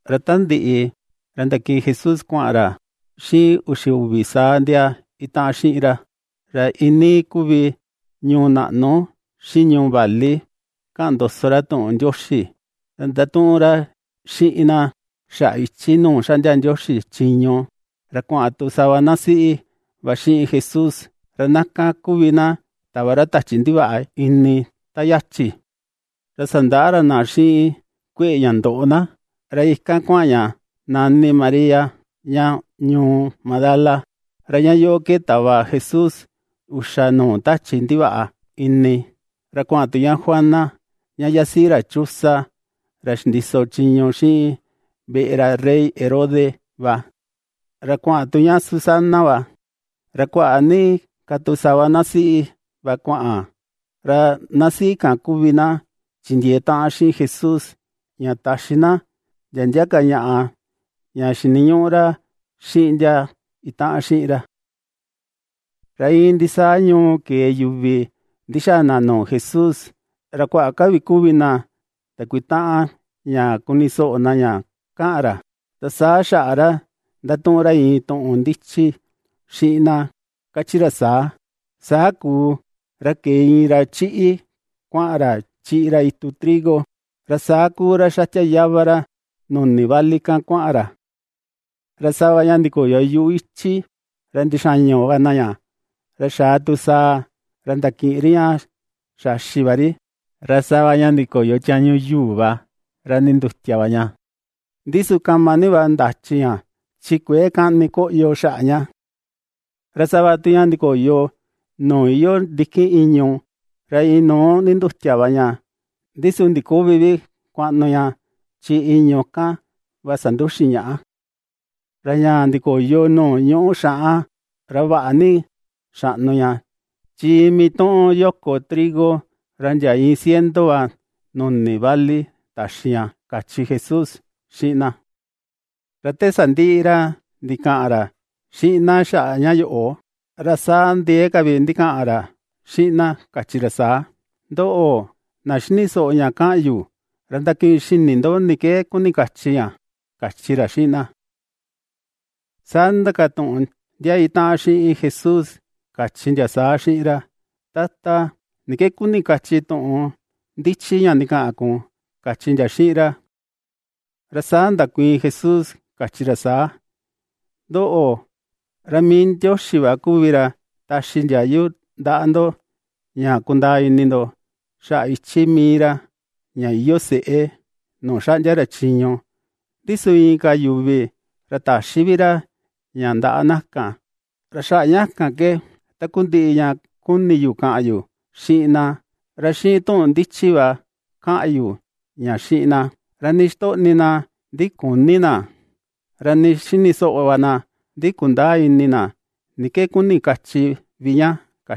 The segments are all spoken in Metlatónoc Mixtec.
Ra ta ndiꞌi, ra ndakiꞌin Jesús kuaꞌan ra xiꞌin uxi uvi saa ndia itaꞌan xiꞌin ra. Ra iinii kuvi ñuu naꞌnu, xiꞌin ñuu vali kaꞌan ndoso ra tuꞌun Ndioxi. Ra ndatuꞌun ra xiꞌin na xaꞌa ichi nuu xaꞌndia Ndioxi chiñu. Ra kuaꞌan tu sava na siꞌi va xiꞌin Jesús, ra na kan kuvi na tava ra tachi ndivaꞌa ini ta yachi, ra sandaꞌa ra na xiꞌin kueꞌe ña ndoꞌo na. Ra ikan kuaꞌan ña nani María ña ñuu Magdala, ra ña yoꞌo ke tava Jesús uxa nuu tachi ndivaꞌa ini. Ra kuaꞌan tu ña Juana ña yasiꞌi ra Chuza ra xindiso chiñu xiꞌin veꞌe ra rey Herodes va; ra kuaꞌan tu ña Susana va, ra kuaꞌa ni ka tu sava na siꞌi va kuaꞌan. Ra na siꞌi kan kuvi na chindiee taꞌan xiꞌin Jesús, ña taxi na ndia ndia ka ñaꞌa ña xiniñuꞌu ra xiꞌin ndia itaꞌan xiꞌin ra. Ra iin ndisaa ñuu ke̱e yuvi ndixaa na nuu Jesús. Ra kuaꞌa ka vi kuvi na ndakuitaꞌan ña kuni soꞌo na ña kaꞌan ra. Ra saa xaꞌa ra ndatuꞌun ra iin tuꞌun ndichi xiꞌin na kachi ra saa: ―Saa kuu, ra kee iin ra chiꞌi kuaꞌan ra chiꞌi ra itu trigo, ra saa kuu ra xatia yava ra nuni vali kan kuaꞌan ra. Ra sava ña ndikoyo yuꞌu ichi, ra ndixañu va na ña, ra xaa tu saa ra ndakiꞌin ri ña xaxi va ri. Ra sava ña ndikoyo tiañu yuu va ra ndindutia va ña. Ndi su kama ni va ndachi ña chi kuëe kani koꞌyo xaꞌa ña. Ra sava tu ña ndikoyo nuu iyoo ndikin ìñu̱, ra inuu ndindutia va ña. Ndi su ndiküvi vi kuaꞌnu ña chi ìñu̱ kan va sanduxin ñaꞌa. Ra ña ndikoyo nuu ñuꞌu xaꞌan, ra vaꞌa ni xaꞌnu ña. Chi iin mituꞌun yoko trigo ra ndia iin ciento va nuni vali taxi ña ―kachi Jesús xiꞌin na. Ra te sandiꞌi ra ndikaꞌan ra xiꞌin na xaꞌa ña yoꞌo, ra saa ndiee ka vi ndikaꞌan ra xiꞌin na, kachi ra saa: ―Ndoꞌo, na xini soꞌo ña kaꞌan yu. Ra ndakiꞌin xini ndo ni ke kuni kachi ña ―kachi ra xiꞌin na. Saa ndindakatuꞌun ndia itaꞌan xiꞌin Jesús, kachi ndia saa xiꞌin ra: ―Tata, ¿ni ke kuni kachi tuꞌun ndichi ña ndikaꞌan kun? ―kachi ndia xiꞌin ra. Ra saa ndakuiin Jesús kachi ra saa: ―Ndoꞌo, ra mii Ndioxi va kuvi ra ^taxi ndiayu ndaꞌa ndo ña kundaa ini ndo xaꞌa ichi mii ra, ña iyoo seꞌe nuu xaꞌndia ra chiñu. Ndi su inka yuvi, ra ^täxi vi ra ña ndaꞌa na kan. Ra xaꞌa ña kan ke takundiꞌi ña kuni yu kaꞌan yu xiꞌin na, ra xiꞌin tuꞌun ndichi va kaꞌan yu ña xiꞌin na. Ra nii ixtoꞌni na, ndi küni na, ra nii xini soꞌo va na, ndi kundäa ini na ni ke kuni kachi vi ña.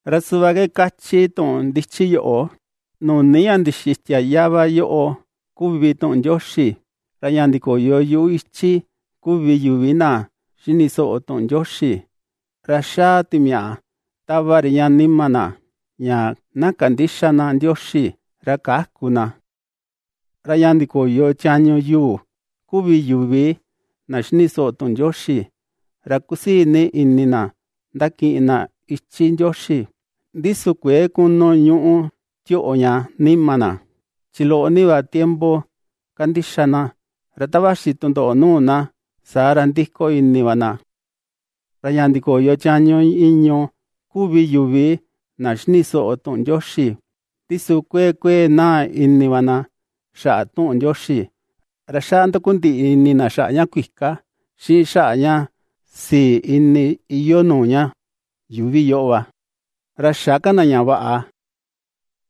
Ra suꞌva ke kachi tuꞌun ndichi yoꞌo: Nuni ña ndixitia yava yoꞌo kuvi tuꞌun Ndioxi. Ra ña ndikoyo yuꞌu ichi, kuvi yuvi na xini soꞌo tuꞌun Ndioxi. Ra xaa timiaꞌa tava ri ña nima na, ña na kandïxa na Ndioxi ra käku na. Ra ña ndikoyo tiañu yuu, kuvi yuvi na xini soꞌo tuꞌun Ndioxi. Ra kusii ni ini na ndakiꞌin na ichi Ndioxi, ndi su kuëe kunu ñuꞌu tioꞌo ña nima na, chi loꞌo ni va tiempo ^kandixa na, ra ta vaxi tundoꞌo nuu na, saa ra ndiko ini va na. Ra ña ndikoyo tiañu ìñu̱, kuvi yuvi na xini soꞌo tuꞌun Ndioxi, ndi su kuee kuee naa ini va na xaꞌa tuꞌun Ndioxi. Ra xaꞌa ndakundiꞌi ini na xaꞌa ña kuika, xiꞌin xaꞌa ña sii ini iyoo nuu ña yuuvi yoꞌo va, ra xä ka na ña vaꞌa.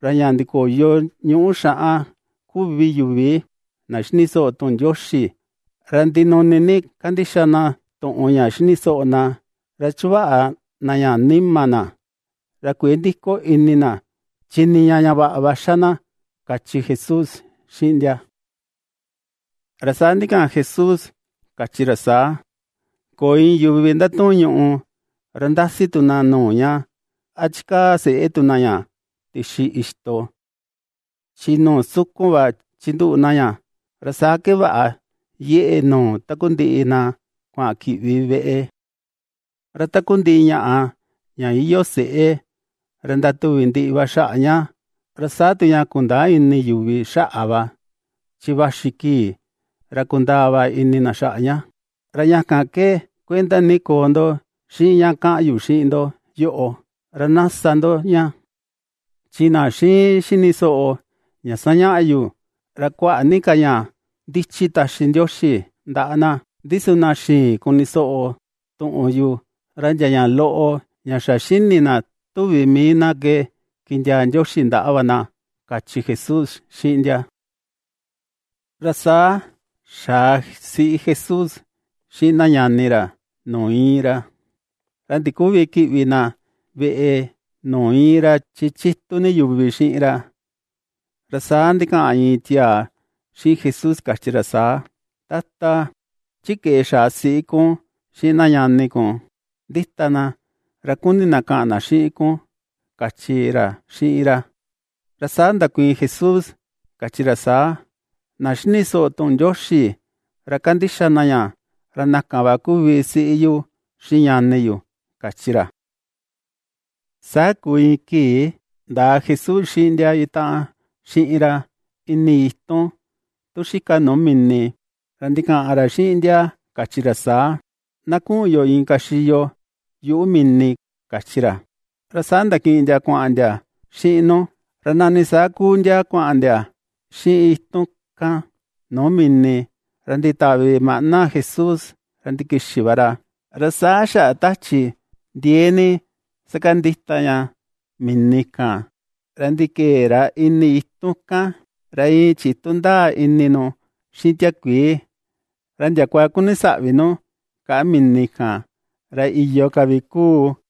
Ra ña ndikoyo ñuꞌu xaꞌan, kuvi yuvi na xini soꞌo tuꞌun Ndioxi. Ra ndinuni ni kandixa na tuꞌun ña xini soꞌo na, ra chuvaꞌa na ña nima na. Ra kuëe ndiko ini na, chi niña ña vaꞌa va xa na ―kachi Jesús xiꞌin ndia. Ra saa ndikaꞌan Jesús kachi ra saa: ―Köo iin yuvi ndatuun ñuꞌu, ra ndasi tu na nuu ña. A chikaa seꞌe tu na ña tixi ixto. Chi nuu sukun va chinduꞌu na ña, ra saa ke vaꞌa yeꞌe nuu takundiꞌi na kuaꞌan kiꞌvi veꞌe. Ra takundiꞌi ñaꞌa ña iyoo seꞌe, ra ndatuvi ndiꞌi va xaꞌa ña, ra saa tu ña kundäa ini yuvi xaꞌa va, chi vaxi kii ra kundaa va ini na xaꞌa ña. ’Ra ña kan ke kuenda ni koo ndo xiꞌin ña kaꞌan yu xiꞌin ndo yoꞌo ra na sa ndo ña. Chi na xiin xini soꞌo ña sañaꞌa yu ra kuaꞌa ni ka ña ndichi taxi Ndioxi ndaꞌa na; ndi su na xïin kuni soꞌo tuꞌun yu, ra ndia ña loꞌo ña xa xini na tuvi mii na ke kindiaa Ndioxi ndaꞌa va na ―kachi Jesús xiꞌin ndia. Ra saa xaa siꞌi Jesús xiꞌin na ñani ra nuu iin ra, ra ndiküvi kiꞌvi na veꞌe nuu iin ra, chi chitu ni yuvi xiꞌin ra. Ra saa ndikaꞌan iin tiaa xiꞌin Jesús kachi ra saa: ―Tata, chi keꞌe xaa siꞌi kun xiꞌin na ñani kun, ndita na, ra kuni na kaꞌan na xiꞌin kun ―kachi ra xiꞌin ra. Ra saa ndakuiin Jesús, kachi ra saa: ―Na xini soꞌo tuꞌun Ndioxi ra kandixa na ña, ra na kan va kuvi siꞌi yu xiꞌin ñani yu ―kachi ra. Saa kuu iin kii ndaa Jesús xiꞌin ndia itaꞌan xiꞌin ra ini itun tu xika nuu mini. Ra ndikaꞌan ra xiꞌin ndia kachi ra saa: ―Na kuꞌun yo inka xiyo yuꞌu mini ―kachi ra. Ra saa ndakiꞌin ndia kuaꞌan ndia xiꞌin nu. Ra nani saa kuu ndia kuaꞌan ndia xiꞌin itun kan nuu mini, ra nditavi maꞌna Jesús ra ndikixi va ra. Ra saa xaꞌa tachi ndiee ni sakandita ña mini kan ra ndikee ra ini itun kan, ra iin chitu ndaa ini nu xiꞌin tiakuii. Ra ndiakua ^kuni saꞌvi nu kaꞌa mini kan, ra iyo ka vi ^kuu.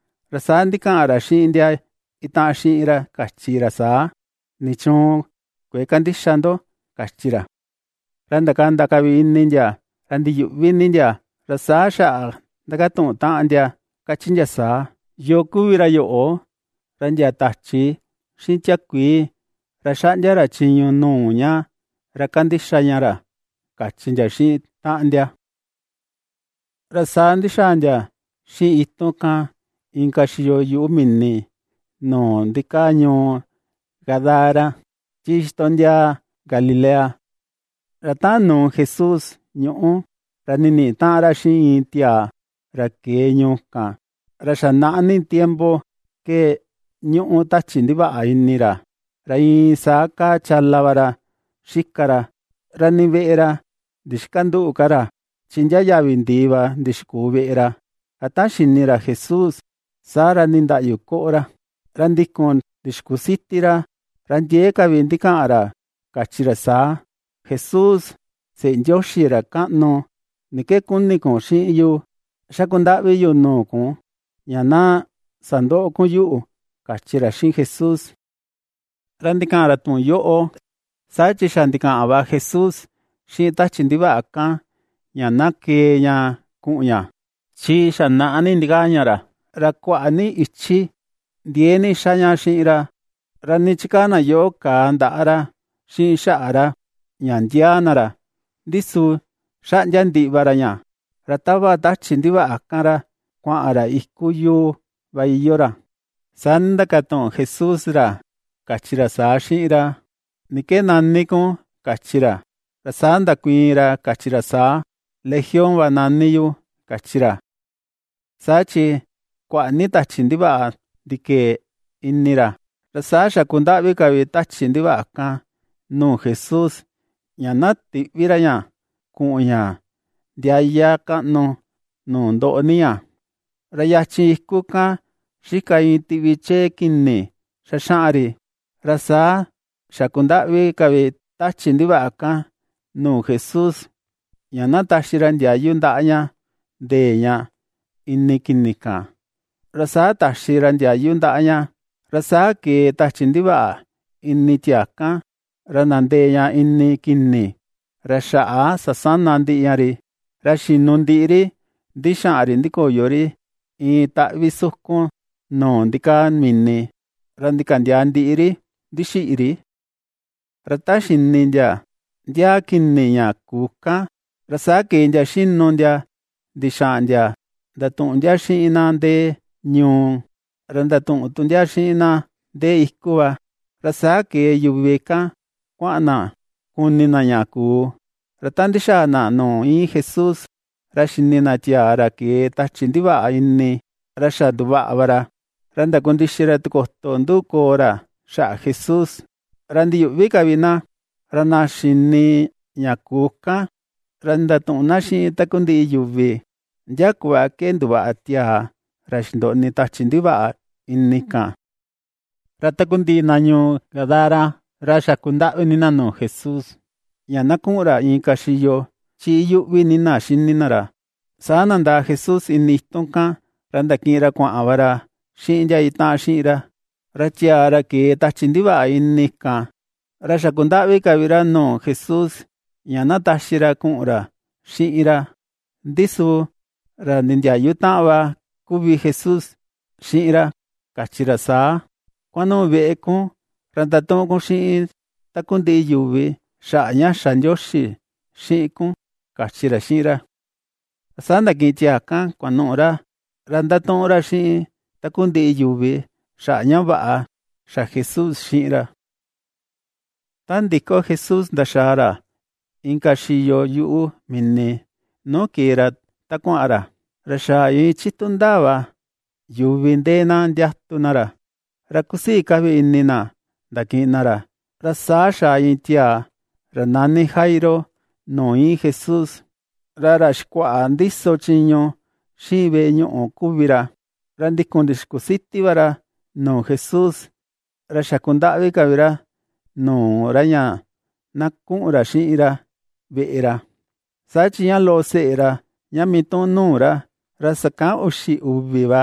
Ra saa ndikaꞌan ra xiꞌin ndia itaꞌan xiꞌin ra kachi ra saa: ―¿Nichuun kuëe kandixa ndo? ―kachi ra. Ra ndakanda ka vi ini ndia, ra ndiyuꞌvi ni ndia, ra saa xaꞌa ndakatuꞌun taꞌan ndia, kachi ndia saa: ―¿Yoo kuvi ra yoꞌo, ra ndia tachi xiꞌin tiakuii ra xaꞌndia ra chiñu nuu ña ra kandixa ña ra? ―kachi ndia xiꞌin taꞌan ndia. Ra saa ndixaa ndia xiꞌin itun kan inka xiyo yuꞌu mini, nuu ndikaa ñuu Gadara, chi xitondiaa Galilea. Ra ta nuu Jesús ñuꞌu, ra niniꞌi taꞌan ra xiꞌin iin tiaa ra ke̱e ñuu kan, ra xa naꞌa ni tiempo ke ñuꞌu tachi ndivaꞌa ini ra. Ra iin saa kaa chala va ra xika ra, ra nii veꞌe ra ndixkandüꞌu ka ra, chi ndia yavi ndii va ndixkuu veꞌe ra. Ra ta xini ra Jesús, saa ra ndindaꞌyu koꞌo ra, ra ndikun ndixkusiti ra, ra ndiee ka vi ndikaꞌan ra, kachi ra saa: ―¡Jesús, Seꞌe Ndioxi Ra Kaꞌnu! ¿Ni ke kuni kun xiꞌin yu? Xaku ndaꞌvi yu nuu kun, ña na sandöꞌo kun yuꞌu ―kachi ra xiꞌin Jesús. Ra ndikaꞌan ra tuꞌun yoꞌo saa chi xa ndikaꞌan va Jesús xiꞌin tachi ndivaꞌa kan ña na kee ña kuꞌun ña. Chi xa naꞌa ni ndikaa ña ra. Ra kuaꞌa ni ichi ndiee ni ^xa ña xiꞌin ra. Ra nii chikaa na yoꞌo kàà ndaꞌa ra xiꞌin xaꞌa ra, ña ndiaa na ra, ndi su xaꞌndia ndiꞌi va ra ña, ra tava tachi ndivaꞌa kan ra kuaꞌan ra iku yuu va iyoo ra. Saa ndindakatuꞌun Jesús ra, kachi ra saa xiꞌin ra: ―¿Ni ke nani kun? ―kachi ra. Ra saa ndakuiin ra, kachi ra saa: ―Legión va nani yu ―kachi ra. Saa chi kuaꞌa ni tachi ndivaꞌa ndikee ini ra. Ra saa xaku ndaꞌvi ka vi tachi ndivaꞌa kan nuu Jesús, ña na tïꞌvi ra ña kuꞌun ña ndiaya kaꞌnu nuu ndoꞌo ni ña. Ra yachin iku kan xika iin tiꞌvi chee kini xaxaꞌan ri. Ra saa xakundaꞌvi ka vi tachi ndivaꞌa kan nuu Jesús, ña na taxi ra ndiayu ndaꞌa ña nde̱e ña ini kini kan. Ra saa taxi ra ndiayu ndaꞌa ña. Ra saa ke̱e tachi ndivaꞌa ini tiaa kan, ra ndandee ña ini kini. Ra xaꞌa sasana ndiꞌi ña ri, ra xinu ndiꞌi ri ndixaꞌan ri ndikoyo ri iin taꞌvi sukun nuu ndikaa mini, ra ndikaꞌa ndiaa ndiꞌi ri ndixiꞌi ri. Ra ta xini ndia ndiaa kini ña kuu kan, ra saa ke̱e ndia xinu ndia ndixaꞌan ndia ndatuꞌun ndia xiꞌin na ndee ñuu. Ra ndatuꞌun tu ndia xiꞌin na ndee iku va. Ra saa ke̱e yuvi kan kuaꞌan na kuni na ña kuu. Ra ta ndixaa na nuu iin Jesús, ra xini na tiaa ra ke̱e tachi ndivaꞌa ini, ra xa nduvaꞌa va ra, ra ndakundixi ra tikoto nduꞌu koo ra xaꞌa Jesús, ra ndiyuꞌvi ka vi na. Ra na xini ña kuu kan, ra ndatuꞌun na xiꞌin takundiꞌi yuvi ndia kuꞌva ke nduvaꞌa tiaa ra xindoꞌni tachi ndivaꞌa ini kan. Ra takundiꞌi na ñuu Gadara, ra xaku ndaꞌvi ni na nuu Jesús, ña na kuꞌun ra inka xiyo, chi iyuꞌvi ni na ^xini na ra. Saa ndandaa Jesús ini itun kan ra ndakiꞌin ra kuaꞌan va ra xiꞌin ndia itaꞌan xiꞌin ra. Ra tiaa ra kee tachi ndivaꞌa ini kan, ra xaku ndaꞌvi ka vi ra nuu Jesús ña na taxi ra kuꞌun ra xiꞌin ra. Ndi su ra nindiayu taꞌan va kuvi Jesús xiꞌin ra, kachi ra saa: ―Kuanuꞌu veꞌe kun, ra ndatuꞌun kun xiꞌin takundiꞌi yuvi xaꞌa ña xa Ndioxi xiꞌin kun ―kachi ra xiꞌin ra. Saa ndakiꞌin tiaa kan kuanuꞌu ra. Ra ndatuꞌun ra xiꞌin takundiꞌi yuvi xaꞌa ña vaꞌa xa Jesús xiꞌin ra. Ta ndiko Jesús ndaxaa ra inka xiyo yuꞌu mini nuu ke̱e ra ta kuaꞌan ra, ra xa iin chitu ndaa va yuvi ndee na ndiatu na ra. Ra ^kusii ka vi ini na ndakiꞌin na ra. Ra saa xaa iin tiaa ra nani Jairo nuu iin Jesús. Ra ra xikuaꞌa ndiso chiñu xiꞌin veꞌe ñuꞌu kuvi ra, ra ndikun ndixkusiti va ra nuu Jesús, ra xaku ndaꞌvi ka vi ra nuu ra ña na kuꞌun ra xiꞌin ra veꞌe ra. Saa chi ña loꞌo seꞌe ra, ña mituꞌun nuu ra, ra sakan uxi uvi va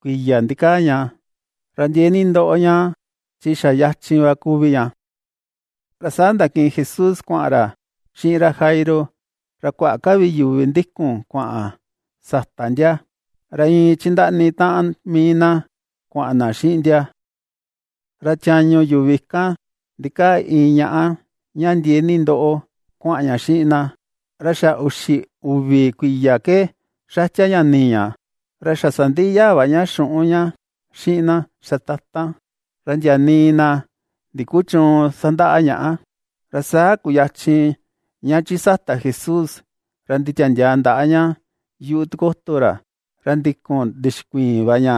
kuiya ndikaa ña, ra ndiee ni ndoꞌo ña chi xa yachin va kuvi ña. Ra saa ndakiꞌin Jesús kuaꞌan ra xiꞌin ra Jairo. Ra kuaꞌa ka vi yuvi ndikun kuaꞌan sata ndia, ra iin chindaꞌni taꞌan mii na kuaꞌan na xiꞌin ndia. Ra tiañu yuvi kan ndikaa iin ñaꞌa ña ndiee ni ndoꞌo kuaꞌan ña xiꞌin na, ra xa uxi uvi kuiya ke xatia ña nii ña. Ra xa sandiꞌi yaa va ña xuꞌun ña xiꞌin na xatatan, ra ndia nii na ndikuchüun sandaꞌa ñaꞌa. Ra saa kuyachin ña chi sata Jesús ra nditiandiaa ndaꞌa ña yuꞌu tikoto ra. Ra ndikun ndixkuiin va ña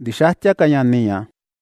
ndixätia ka ña nii ña.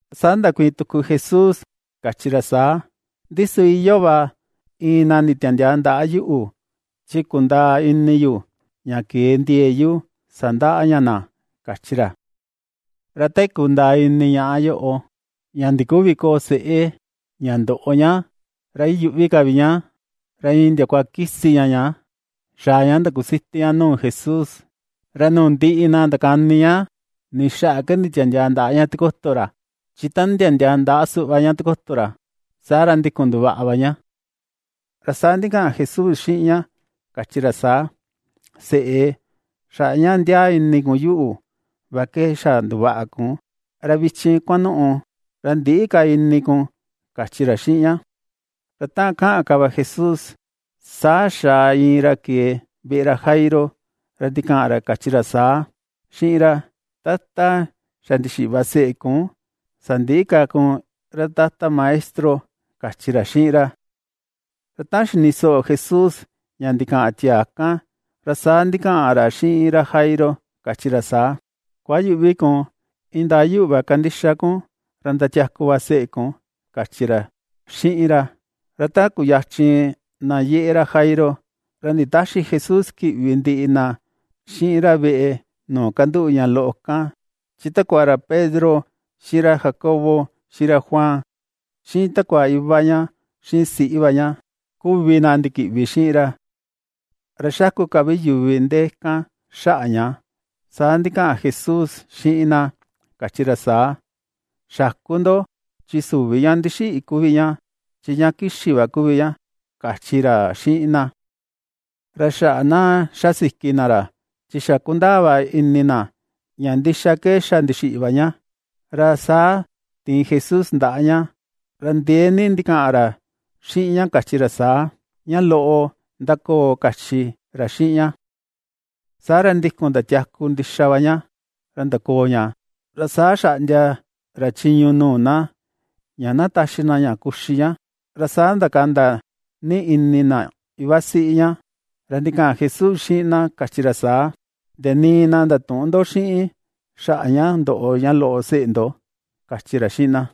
Saa ndakuiin tuku Jesús kachi ra saa: ―Ndi su iyoo va iin na nditiandiaa ndaꞌa yuꞌu, chi kundaa ini yu ña ke̱e ndie̱e̱ yu sandaꞌa ña na ―kachi ra. Ra te kundaa ini ñaꞌa yoꞌo ña ndiküvi koo seꞌe, ña ndoꞌo ña, ra iyuꞌvi ka vi ña, ra iin ndiakua kisi ña ña xaa ña ndixkusiti ña nuu Jesús. Ra nuu ndiꞌi na ndakani ña ni xaꞌa ke nditiandiaa ndaꞌa ña tikoto ra. Chi ta nditiandiaa ndaꞌa suꞌva ña tikoto ra, saa ra ndikun nduvaꞌa va ña. Ra saa ndikaꞌan Jesús xiꞌin ña, kachi ra saa: ―Seꞌe, xaꞌa ña ndiaa ini kun yuꞌu va ke xa nduvaꞌa kun. Ra vichin kuanuꞌu, ra ndïꞌi ka ini kun ―kachi ra xiꞌin ña. Ra ta kaꞌan ka va Jesús, saa xaa iin ra ke̱e veꞌe ra Jairo, ra ndikaꞌan ra kachi ra saa xiꞌin ra: ―Tata, xa ndixiꞌi va seꞌe kun, sandïꞌi ka kun ra Tata Maestro ―kachi ra xiꞌin ra. Ra ta xini soꞌo Jesús, ña ndikaꞌan tiaa kan, ra saa ndikaꞌan ra xiꞌin ra Jairo, kachi ra saa: ―Kuayüꞌvi kun. Indaa yuꞌu va kandixa kun, ra ndatiaku va seꞌe kun ―kachi ra xiꞌin ra. Ra ta kuyachin na yeꞌe ra Jairo, ra nditäxi Jesús kiꞌvi ndiꞌi na xiꞌin ra veꞌe nuu kanduꞌu ña loꞌo kan, chi takua ra Pedro, xiꞌin ra Jacobo, xiꞌin ra Juan xiꞌin takua iva ña xiꞌin siꞌi va ña kuvi na ndikiꞌvi xiꞌin ra. Ra xaku ka vi yuvi ndee kan xaꞌa ña. Saa ndikaꞌan Jesús xiꞌin na, kachi ra saa: ―Xäku ndo chi süvi ña ndixiꞌi kuvi ña. Chi ña kixi va kuvi ña ―kachi ra xiꞌin na. Ra xaꞌa na ^xa siki na ra, chi xa kundaa va ini na ña ndixa ke xa ndixiꞌi va ña. Ra saa tiin Jesús ndaꞌa ña. Ra ndiee ni ndikaꞌan ra xiꞌin ña, kachi ra saa: ―¡Ña loꞌo, ndakoo! ―kachi ra xiꞌin ña. Saa ra, ndikun ndatiaku ndixa va ña, ra ndakoo ña. Ra saa xaꞌndia ra chiñu nuu na, ña na taxi na ña kuxi ña. Ra saa ndakanda ni ini na ivasiꞌi ña. Ra ndikaꞌan Jesús xiꞌin na, kachi ra saa: ―Ndia nii na ndatüꞌun ndo xiꞌin xaꞌa ña ndoꞌo ña loꞌo seꞌe ndo ―kachi ra xiꞌin na.